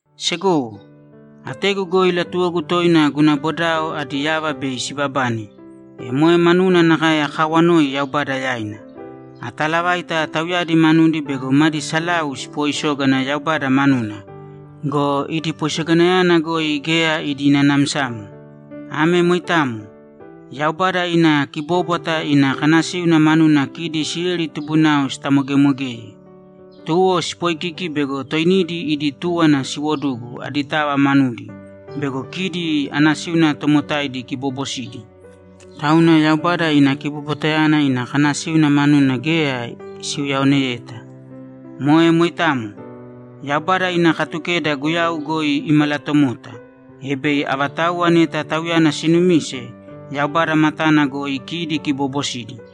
Segowo, ategu goi latuwogu toina guna bodao adi yava bei sibabane, e moe manuna nakae akaawanoi Yaubada yaina. Ataalavaita tauyadi manudi bego madi salau sipooisógana Yaubada manuna go, idi poisoganayana goi geya idi nanamsamo. Ame moitamo. Yaubada ina kibóbwata ina kanasíuna manuna kidi Isileli tubunao sitamogemogeye. Tuwo sipoikiki bego toinidi idi túwana siwodugu aditava manudi bego kidi anasíuna tomotaidi kiboobosidi. Tauna Yaubada ina kibobwatayana ina kanasíuna manuna geya siuyaoneyeta. Moe moitamo. Yaubada ina Katukeda Guyau goi imalatomota, e bei avatauwa neta Tauyana sinumise, Yaubada matana goi kidi kiboobosidi.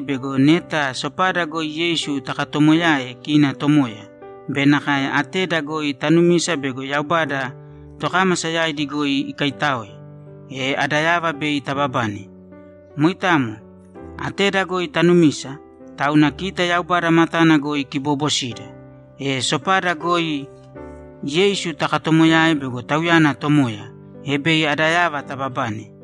bego neta sopada goi Yeisu takatomoyae kina Tomoya be nakae ateda goi tanumisa bego Yaubada tokámasa yaidi goi ikaitáoe, e ada yava bei tababane. Moitamo. Ateda goi tanumisa, tauna kita Yaubada matana goi kiboobosida. E sopada goi Yeisu takatomoyae bego Tauyana Tomoya, e bei ada yava tababane.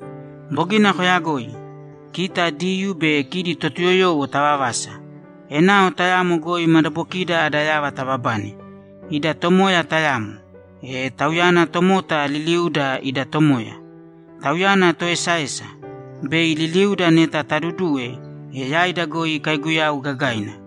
Bogina koyagoi. Kita Diyuu be kidi Totuyoyowo tavavasa; enao tayamo goi madabokida ada yava tababane. Ida Tomoya tayamo; e Tauyana tomota liliuuda ida Tomoya. Tauyana Toesaesa; bei liliuda neta taduduwe, e yaida goi ikaiguyau gagaina.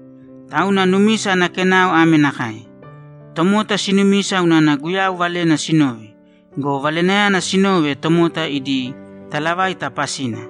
Tauna numisa ana kenao ame nakae: Tomota sinumisa unana Guyau Valena sinove go, Valenayana sinove tomota idi talavaita pasina.